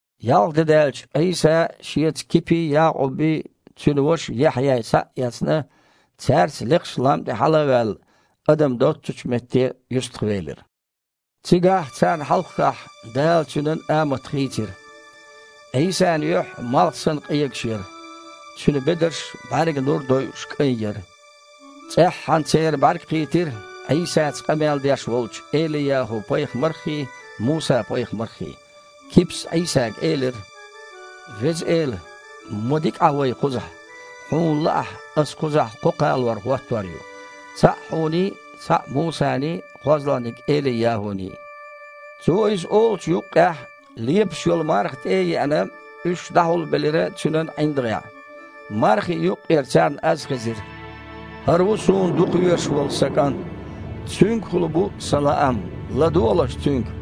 Ялх де даьлча, Іийса, Шеца Кипий, Якъуббий, цуьнан ваша Яхьъяй схьа а эцна, цаьрца лекхачу лам тІе хьала а ваьлла, адам доццучу метте юьстахвелира. Цигахь, царна хьалххахь, Дала Цуьнан амат хийцира. Іийсан юьхь, малх санна, къегаш яра, Цуьнан бедарш бІаьрган нур дойуш кІайн яра. ЦІеххьана церан бІаьрг кхийтира Іийсаца къамел деш волчу Эли-ЯхІу-пайхамарххий, Муса-пайхамарххий. Кипас Іийсага элира: «Веза Эла! Ма дика Іа вай кхузахь! Хьуна лаахь, аса кхузахь кхо кхалор хІоттор ю: цхьаъ Хьуний, цхьаъ Мусаний, кхозлагІниг Эли-ЯхІуний». Цо иза олучу юккъехь, лепаш йолу марха тІе а еана, уьш дІахьулбелира цуьнан ІиндагІехь. Мархи юккъера царна аз хезира: «ХІара ву Суна дукхавезаш волу Сан КІант! Цуьнгахула бу Сан лаам! ЛадогІалаш Цуьнга!»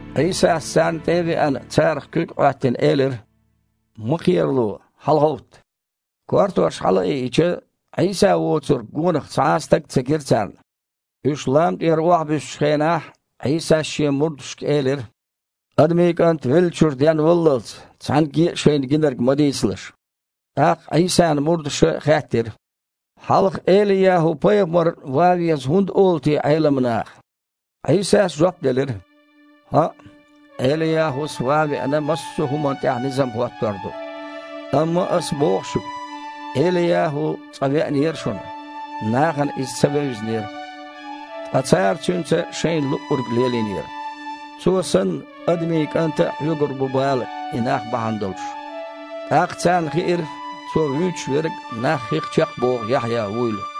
Іийсас, царна тІе а веана, царах куьг а Іоьттина, элира: «Ма кхерало, хьалагІовтта!» Кортош хьалаайича, Іийса воцург, гонах цхьа а стаг ца гира царна. Уьш лам тІера охьабуьссучу хенахь Іийсас Шен мурдашка элира: « Адамийн КІант веллачуьра денваллалц цхьаьнгге а шайна гинарг ма дийцалаш!» ТІаккха Іийсан мурдаша хаьттира: «Хьалха Эли-ЯхІу-пайхамар ван веза хІунда олу те Іелам наха?» Іийсас жоп делира: «ХІаъ, Эли-ЯхІус, ван а веана, массо а хІуманна тІехь низам хІоттор ду. Амма Аса боху шуьга, Эли-ЯхІу цкъа веанера шуна. Нахана иза ца вевзинера. Ткъа цара цуьнца шайна луъург лелийнера. Цо санна, Адамийн КІанта а хьоьгур бу бала и нах бахьана долуш». ТІаккха царна хиира Цо вуьйцуш верг нах хих чекхбоху Яхьъя вуйла.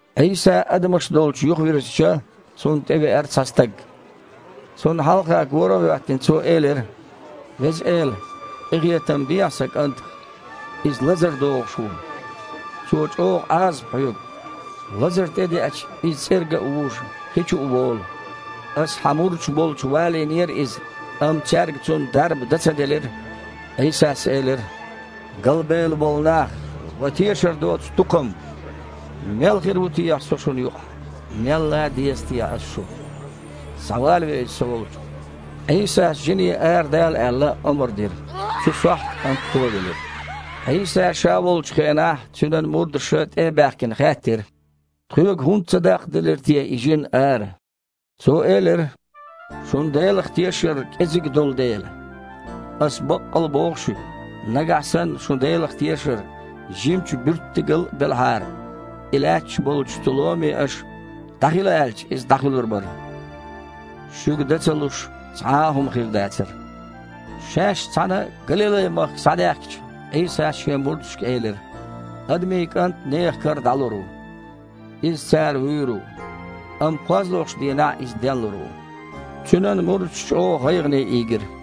Іийса адамаш долчу юхавирзича, Цунна тІевеара цхьа стаг. Цунна хьалха гора а хІоьттина, цо элира: «Веза Эла! Къинхетам бехьа сан кІантах! Иза лазар догІуш ву. Цо чІогІа Іазап хьоьгу. Лазар тІедеъча, иза цІерга а вужу, хи чу а волу. Аса Хьан мурдаш болчу валийнера иза, амма цаьрга цунна дарба дан ца делира». Іийсас элира: «Галбевлла болу нах! Ва тешар доцу тукхам! Мел хир ву техьа Со шуна юкъахь? Мел лан деза техьа Аса шу? Схьавалаве иза Со волчу!» Іийсас жине, арадала аьлла, омра дира. Цу сохьта кІант товелира. Іийса Ша волчу хенахь Цуьнан мурдаша, тІе а баьхкина, хаьттира: «Тхоьга хІунда ца даккхаделира те и жин ара?» Цо элира: «Шун Делах тешар кІезиг долу дела. Аса баккъал боху шуьга: нагахь санна шун Делах тешар жимачу буьрттигал а белахьара, и лаьтташ болчу цу ломе аша „ДІахила“ аьлча, иза дІахуьлур бара. Шуьга да ца луш цхьа а хІума хир дацара». Шаьш цхьаьна Галилай-махка схьадаьхкича, Іийсас Шен мурдашка элира: «Адамийн КІант нехан кара дІалур ву. Иза цара вуьйр ву. Амма кхозлагІчу дийнахь Иза денлур ву». Цуьнан мурдаш чІогІа гІайгІане ийгира.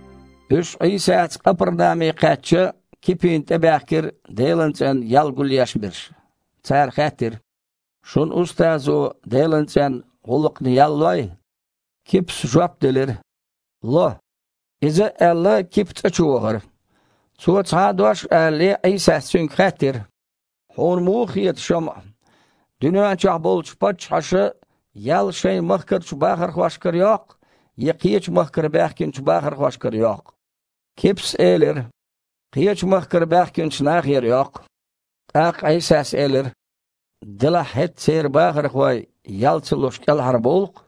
Уьш Іийсаца Къапарнаме кхаьчча, Кипина тІебаьхкира Делан цІенна ял гулъеш берш. Цара хаьттира: «Шун устазо Делан цІенна гІуллакхна ял лой?» Кипас жоп делира: «Ло!» Иза а аьлла, Кипа цІа чу вахара. Цо цхьа а дош алале, Іийсас цуьнга хаьттира: «Хьуна муха хета, ШамІа: дуьнен чохь болчу паччахьаша ял шайн махкарчу бахархошкара йоккху, я кхечу махкара баьхкинчу бахархошкара йоккху?» Кипас элира: «Кхечу махкара баьхкинчу нахера йоккху». ТІаккха Іийсас элира: «Делахь хІета церан бахархой, ял ца луш, кІелхьарбовлу-кх.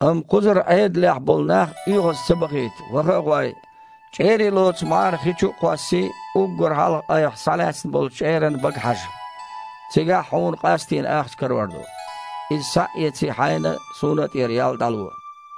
Амма кхузара Іедалехь болу нах оьгІаз ца бахийта, ваха а гІой, чІерий лоцу мІара хи чу а кхоссий, уггар хьалха айхьа схьалаьцна болчу чІеран бага хьажа. Цигахь хьуна къастийна ахча карор ду. Иза схьа а эций, хьайна а, Суна а тІера ял дІало».